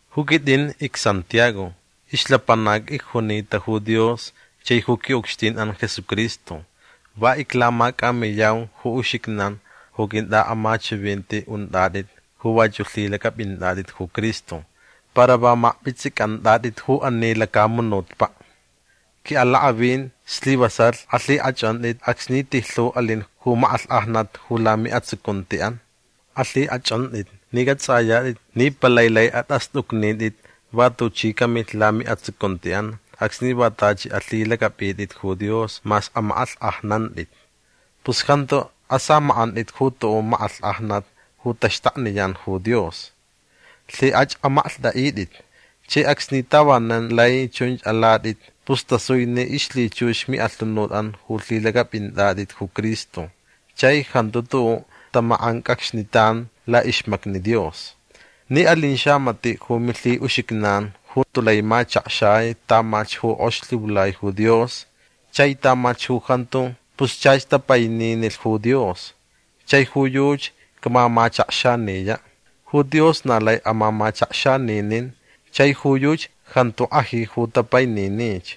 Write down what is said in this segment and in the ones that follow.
Ju quitʼin icSantiago. Ixlapanac icjunita ju Dios chai ju quiʼucxtinʼan Jesucristo. Va iclamacʼamiyau ju uxijnan ju quintʼaʼamachivinti untʼatʼit ju vachuʼ lhilacʼapʼintʼatʼit ju Cristo para va makpʼitsʼicʼantʼatʼit ju ani lacamunutpaʼ. Quiʼalakʼavin slivasalh alhikʼachʼantʼit acsni tijlhu alin ju makʼalhkʼajnat ju lamiʼatsucuntiʼan. Alhikʼachʼantʼit ni cʼatsʼayatʼit ni palai lai atʼastʼucnitʼit va tuchi camilh lamiʼatsucuntiʼan acsni va tachi alhilacʼapʼitʼit ju Dios mas amakʼalhkʼajnantʼit. Pus jantu asamakʼantʼit ju tuʼuʼ makʼalhkʼajnat ju taxtakniyan ju Dios. Lhikʼach amaklhtʼaʼitʼit. Chai acsni tavanan lai chunch alatʼit pus tasui ni ixlhichux miʼalhunutʼan ju lhilacʼapʼintʼatʼit ju Cristo chai jantu tuʼuʼ tamakʼancʼacxnitan laʼixmacni Dios. Ni alin xamatiʼ ju milhiʼuxijnan ju tulai machakxai tamalhch ju kʼox lhiulai ju Dios chai tamalhch ju jantu pus chach tapainini ju Dios chai ju yuchi camamachakxaniyaʼ. Ju Dios na lai amamachakxaninin chai ju yuchi jantu kʼaji ju tapaininich.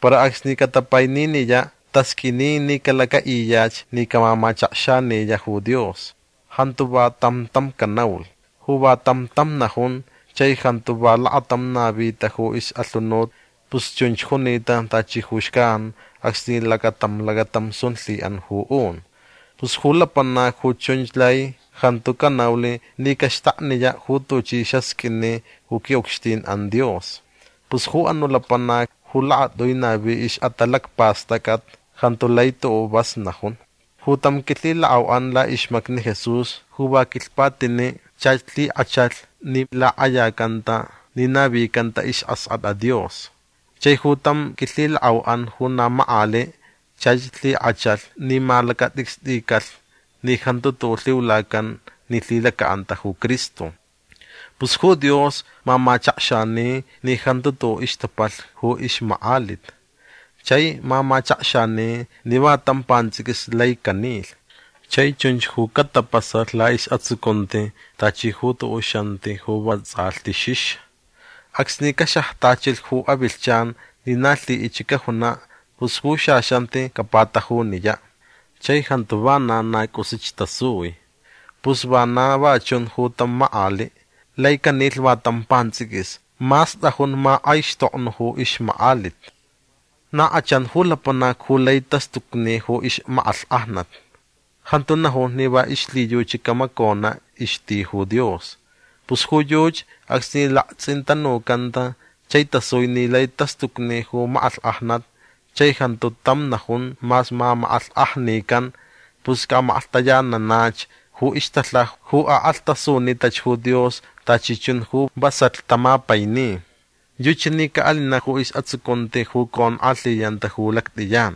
Para acsni catapaininiyaʼ tasqʼuini ni calacaʼiyach ni camamachakxaniyaʼ ju Dios. Jantu va tam tam canaulh. Ju va tam tam najun chai jantu va lakatam navita ju ixʼalhunut pus chunch junita tachi ju xcan acsni lacatam lacatam sun lhiʼan ju un. Pus ju lapanac ju chunch lai jantu canaulh ni caxtakniyaʼ ju tuchi xasqʼuini ju quiʼucxtinʼan Dios. Pus ju anuʼ lapanac ju lakatʼui navi ixʼatalacpastʼacʼat jantu lai tuʼuʼ vas najun. Ju tam quilhilakʼauʼan laʼixmacni Jesús ju va quilhpatiniʼ chach lhikʼachalh ni lakʼayacanta ni navicanta isʼaskʼatʼa Dios. Chai ju tam quilhilakʼauʼan ju na makʼaliʼ chach lhikʼachalh ni malacatʼicstʼicalh ni jantu tuʼuʼ lhiulacan ni lhilacaʼanta ju Cristo. Pus ju Dios mamachakxani ni jantu tuʼuʼ ixtapalh ju ixmakʼalit. Chai mamachakxani ni va tam pantsʼiquis lai canilh. Chai chunch ju catapasalh laʼisʼatsucunti tachi ju tuʼuʼ xanti ju va tsʼalhti xixa. Acsni caxajtachilh ju avilhchan ni na lhiʼichich cajunaʼ pus ju xaxanti capatajuniyaʼ. Chai jantu vana na cʼusich tasui. Pus vana va chun ju tam makʼaliʼ. Lai canilh va tam pantsʼiquis mas tʼajun makʼaixtoknuʼ ju ixmakʼalit. Na kʼachan ju lapanac ju lai tastucni ju ixmakʼalhkʼajnat. Jantu najun ni va ixlhiyuchi camaconaʼ ixti ju Dios. Pus ju yuchi acsni laktsʼintanucanta chai tasui ni lai tastucni ju makʼalhkʼajnat chai jantu tam najun mas mamakʼalhkʼajnican pus caʼamaklhtayananach ju ixtalhaja ju akʼalhtasunitach ju Dios tachi chun ju vasalh tamapaini. Yuchi ni caʼalinaʼ ju isʼatsucunti ju conkʼalhiyanta ju lactʼiyan.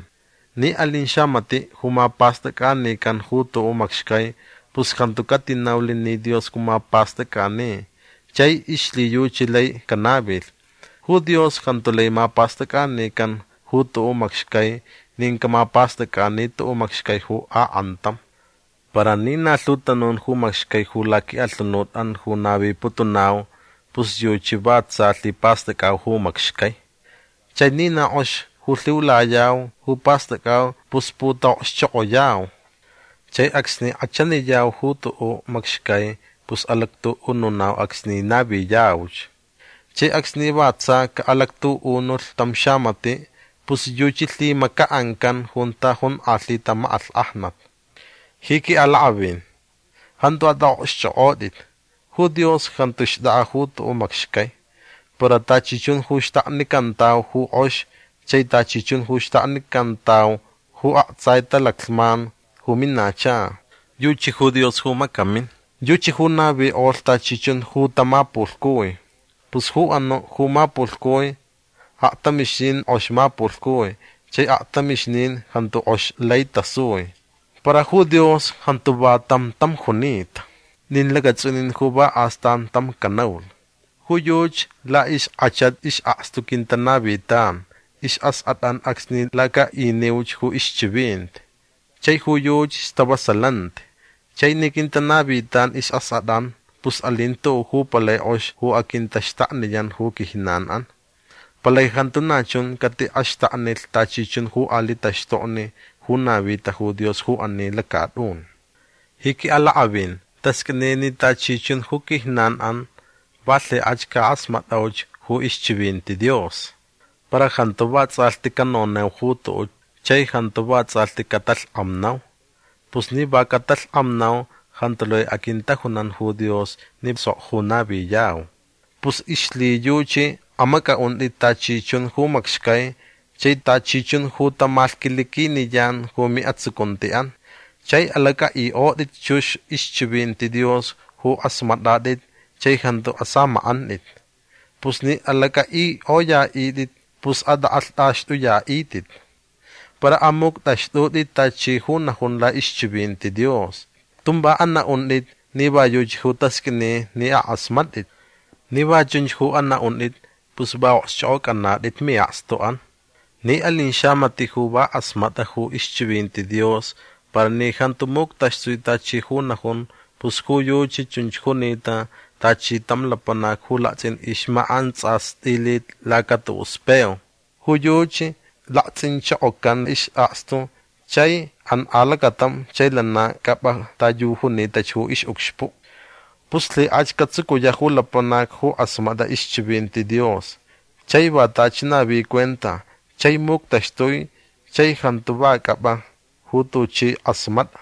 Ni alin xamatiʼ ju mapastʼacʼanican ju tuʼuʼ macxcai pus jantu catinaulh ni Dios ju mapastʼacʼani chai ixlhiyuchi lai canavilh. Ju Dios jantu lai mapastʼacʼanican ju tuʼuʼ macxcai nin camapastʼacʼani tuʼuʼ macxcai ju akʼantam. Para ni na lhu tanun ju macxcai ju laquiʼalhunutʼan ju naviputunau pus yuchi va tsa lhipastʼacʼau ju macxcai. Chai ni na kʼox ju lhiulayau ju pastʼacʼau pus putaʼokxchokʼoyau. Chai acsni kʼachaniyau ju tuʼuʼ macxcai pus alactuʼununau acsni naviyauch. Chai acsni va tsa caʼalactuʼunulh tam xamatiʼ pus yuchi lhimacaʼancan junta jonkʼalhita makʼalhkʼajnat. Ji quiʼalakʼavin jantu atʼaʼokxchʼokʼotʼit. Ju Dios jantu xtʼakʼa ju tuʼuʼ macxcai. Para tachi chun ju xtaknicantau ju kʼox chai tachi chun ju xtaknicantau ju aktsai talaclhman ju minacha. Yuchi ju Dios ju macamin. Yuchi ju navikʼolh tachi chun ju tamapulhcui. Pus ju anuʼ ju mapulhcui aktamixnin kʼox mapulhcui chai aktamixnin jantu kʼox lai tasui. Para ju Dios jantu va tam tam junita. Nin lacatsʼunin ju va astan tam canaulh. Ju yuchi laʼixkʼachat isʼakstu quintanavitan isʼaskʼatʼan acsni lacaʼiniuch ju ixchivinti. Chai ju yuchi stavasalanti. Chai ni quintanavitan isʼaskʼatʼan pus alin tuʼuʼ ju palai kʼox ju aquintaxtakniyan ju quijnanʼan. Palai jantu na chun catiʼaxtaknilh tachi chun ju aliʼ taxtokni ju navita ju Dios ju ani lacatʼun. Ji quiʼalakʼavin tasqʼuini ni tachi chun ju quijnanʼan va lhikʼach cakʼasmatʼauch ju ixchivinti Dios. Para jantu vatsʼalhti canonau ju tuʼuʼ chai jantu vatsʼalhti catalhkʼamnau. Pus ni va catalhkʼamnau jantu lai aquintajunan ju Dios ni sok ju naviyau. Pus ixlhiyuchi amacʼaʼuntʼit tachi chun ju macxcai chai tachi chun ju tamalhquiliquiniyan ju miʼatsucuntiʼan. Chai alacʼaʼikʼotʼit chux ixchivinti Dios ju kʼasmatʼatʼit chai jantu asamakʼantʼit. Pus ni alacʼaʼikʼoyaʼitʼit pus atʼakʼalhtʼaxtʼuyaʼitʼit. Para amuctʼaxtʼutʼit tachi ju najun laʼixchivinti Dios. Tun va anaʼuntʼit ni va yuchi ju tasqʼuini ni akʼasmatʼit. Ni va chunch ju anaʼuntʼit pus va okxchʼokʼocʼanatʼit miʼakstuʼan. Ni alin xamatiʼ ju va kʼasmatʼa ju ixchivinti Dios para ni jantu muctaxtui tachi ju najun pus ju yuchi chunch junita tachi tam lapanac ju laktsʼin ixmakʼantsastʼilit laca tuʼuʼ speo. Ju yuchi laktsʼinchokocan isʼakstu chai an alacatam chai lana cʼapʼa ta yu junitach ju ixʼucxpuʼ. Pus lhikʼach catsucuyaʼ ju lapanac ju kʼasmatʼa ixchivinti Dios chai va tachi navi cuenta chai muctaxtui chai jantu va cʼapʼa ju tuchi kʼasmatʼa.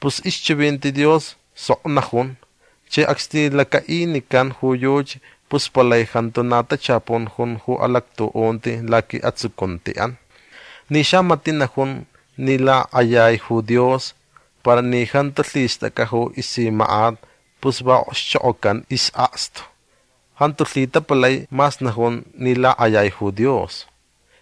Pus ixchivinti Dios sok najun chai acsni lacaʼinican ju yuchi pus palai jantu na tachapun jun ju alactuʼunti laquiʼatsucuntiʼan. Ni xamatiʼ najun ni lakʼayai ju Dios para ni jantu lhistʼacʼa ju isimakʼat pus va okxchokʼocan isʼakstu. Jantu lhitapalai mas najun ni lakʼayai ju Dios.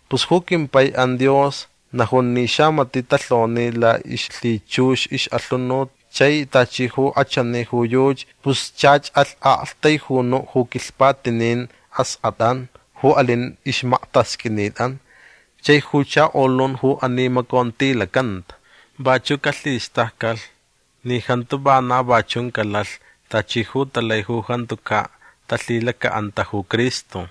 Pus ju quimpaiʼan Dios najun ni xamatiʼ talhoni laʼixlhichux ixʼalhunut chai tachi ju kʼachani ju yuchi pus chach alh aʼaktaijunuʼ ju quilhpatinin askʼatʼan ju alin ixmaktasqʼuinitʼan chai ju chakolun ju animacontilacanta. Vachuʼ calhistaccalh ni jantu vana va chun calalh tachi ju talai ju jantucaʼ talhilacaʼanta ju Cristo.